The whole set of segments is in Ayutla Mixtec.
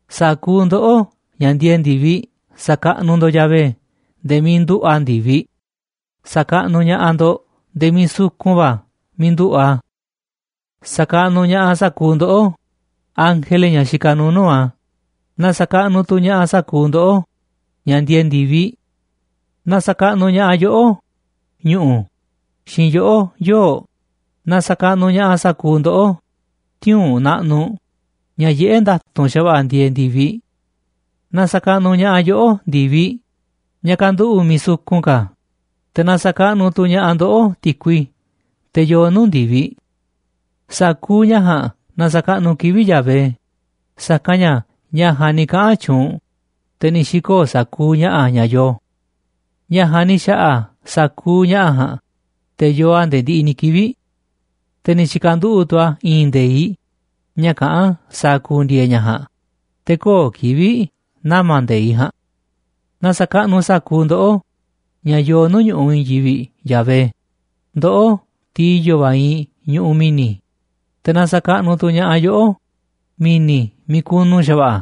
Sa̱kuuꞌ ndoꞌó, ña̱ ndieeꞌ ndi̱viꞌ, sa̱kaꞌnuꞌ ndo̱ꞌ Yahvé nde̱e̱ miiꞌ nduꞌu̱ꞌ a̱ ndi̱viꞌ. Sa̱kaꞌnuꞌ ña̱ꞌaꞌ ndo̱ꞌ nde̱e̱ miiꞌ sukun va̱ miiꞌ nduꞌu̱ꞌ a̱. Sa̱kaꞌnuꞌ ña̱ꞌaꞌ sa̱kuuꞌ ndoꞌó, ángele, ña̱ xikaꞌ nuuꞌ nuu̱ꞌ a̱. Na sa̱kaꞌnuꞌ tu̱ ña̱ꞌaꞌ sa̱kuuꞌ ndoꞌó, ña̱ ndieeꞌ ndi̱viꞌ. Na sa̱kaꞌnuꞌ ña̱ꞌaꞌ yoꞌó, ñu̱ꞌu̱, xiinꞌ yoꞌó, yoo̱ꞌ. Na sa̱kaꞌnuꞌ ña̱ꞌaꞌ sa̱kuuꞌ ndoꞌó, tiuu̱nꞌ naꞌnuꞌ, ña̱ yiꞌé nda̱tu̱nꞌ xa̱va̱ꞌa̱ ndieeꞌ ndi̱viꞌ. Na sa̱kaꞌnuꞌ ña̱ꞌaꞌ yoꞌó, ndi̱viꞌ, ña̱ kanduꞌu̱ꞌ miiꞌ sukun ka̱. Te̱ na sa̱kaꞌnuꞌ tu̱ ña̱ꞌaꞌ ndoꞌó, ti̱kui, teꞌ yoo nuu̱ꞌ ndi̱viꞌ. Sa̱kuuꞌ ña̱ ja̱a̱nꞌ na sa̱kaꞌnuꞌ kivi̱ꞌ Yahvé, sa̱kanꞌ ña̱ ña̱ ja̱a̱nꞌ ni̱ kaꞌa̱n tyuunꞌ, te̱ ni̱ xi̱koo̱ sa̱kuuꞌ ña̱ꞌa̱ ña̱ yoo. Ña̱ ja̱a̱nꞌ ni̱ xa̱ꞌa̱ sa̱kuuꞌ ña̱ꞌa̱ ja̱a̱nꞌ, te̱ yoo a̱ nde̱e̱ ndiꞌiꞌ ni̱ kivi̱ꞌ, te̱ ni̱ tyi̱ka̱nduꞌu̱ꞌ tu̱ a̱ i̱i̱n nde̱iꞌ ña̱ kaꞌán sa̱a̱ ku̱ndi̱e̱e̱ ña̱ ja̱a̱nꞌ, te̱ kö̱o̱ kivi̱ꞌ nama̱ nde̱iꞌ ja̱a̱nꞌ. Na sa̱kaꞌnuꞌ sa̱kuuꞌ ndoꞌó, ña̱ yoo nuu̱ꞌ ñu̱ꞌuꞌ i̱i̱n yivi̱ꞌ, Yahvé, ndoꞌó, tiꞌ i̱yo̱ va̱ iinꞌ ñuꞌuꞌ mi̱ni̱. Te̱ na sa̱kaꞌnuꞌ tu̱ ña̱ꞌaꞌ yoꞌó, mi̱ni̱ miiꞌ kunu xa̱va̱ꞌa̱.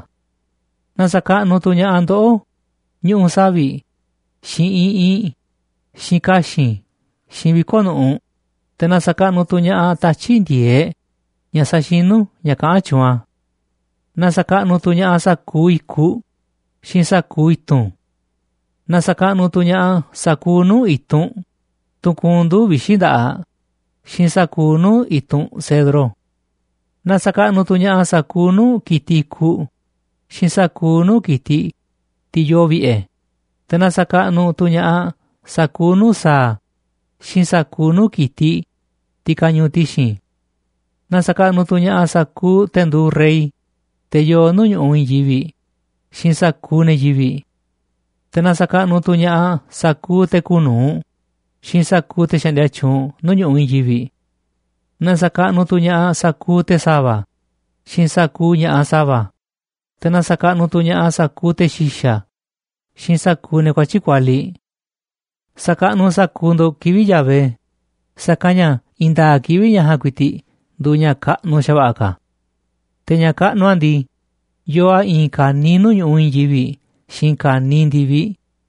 Na sa̱kaꞌnuꞌ tu̱ ña̱ꞌaꞌ ndoꞌó, ñuꞌu̱ savi̱ꞌ, xiinꞌ iꞌinꞌ, xiinꞌ ka̱xi̱n, xiinꞌ viko̱ꞌ nu̱ꞌuꞌ. Te̱ na sa̱kaꞌnuꞌ tu̱ ña̱ꞌaꞌ tatyi̱ꞌ ndi̱e̱eꞌ ña̱ saxinú ña̱ kaꞌán tyuunꞌ a̱. Na sa̱kaꞌnuꞌ tu̱ ña̱ꞌaꞌ sa̱kuuꞌ i̱kuꞌ xiinꞌ sa̱kuuꞌ i̱tu̱n. Na sa̱kaꞌnuꞌ tu̱ ña̱ꞌaꞌ sa̱kuuꞌ nuu̱ꞌ i̱tunꞌ, tunꞌ kuunꞌ nduu̱ꞌ vixi̱ nda̱ꞌaꞌ, xiinꞌ sa̱kuuꞌ nuu̱ꞌ i̱tunꞌ cedro. Na sa̱kaꞌnuꞌ tu̱ ña̱ꞌaꞌ sa̱kuuꞌ nuu̱ꞌ ki̱tiꞌ i̱kuꞌ xiinꞌ sa̱kuuꞌ nuu̱ꞌ ki̱tiꞌ, tiꞌ yoo vi̱ꞌe̱. Te̱ na sa̱kaꞌnuꞌ tu̱ ña̱ꞌaꞌ sa̱kuuꞌ nuu̱ꞌ sa̱a̱ xiinꞌ sa̱kuuꞌ nuu̱ꞌ ki̱tiꞌ, tiꞌ kañuuꞌ ti̱xi̱n. Na sa̱kaꞌnuꞌ tu̱ ña̱ꞌaꞌ sa̱kuuꞌ te̱ nduuꞌ rey, te̱ yoo nuu̱ꞌ ñu̱ꞌuꞌ i̱i̱n yivi̱ꞌ, xiinꞌ sa̱kuuꞌ ne̱ yivi̱ꞌ. Te̱ na sa̱kaꞌnuꞌ tu̱ ña̱ꞌaꞌ sa̱kuuꞌ te̱ kuuꞌ nu̱uꞌ xiinꞌ sa̱kuuꞌ te̱ xaꞌndia tyuunꞌ nuu̱ꞌ ñu̱ꞌuꞌ i̱i̱n yivi̱ꞌ. Na sa̱kaꞌnuꞌ tu̱ ña̱ꞌaꞌ sa̱kuuꞌ te̱ sa̱va̱ xiinꞌ sa̱kuuꞌ ña̱ꞌaꞌ sa̱va̱. Te̱ na sa̱kaꞌnuꞌ tu̱ ña̱ꞌaꞌ sa̱kuuꞌ te̱ xi̱xa̱ xiinꞌ sa̱kuuꞌ ne̱ kuatyi̱ꞌ kualiꞌ. Sa̱kaꞌnuꞌ sa̱kuuꞌ ndo̱ꞌ kivi̱ꞌ Yahvé, sa̱kanꞌ ña̱ i̱i̱n nda̱a̱ꞌ kivi̱ꞌ ña̱ ja̱a̱nꞌ ku̱i̱ti̱ꞌ nduuꞌ ña̱ kaꞌnuꞌ xa̱va̱ꞌa̱ ka̱. Te̱ ña̱ kaꞌnuꞌ a̱ ndii, yoo a̱ i̱i̱n ka̱niiꞌ nuu̱ꞌ ñu̱ꞌuꞌ i̱i̱n yivi̱ꞌ xiinꞌ ka̱niiꞌ ndi̱viꞌ.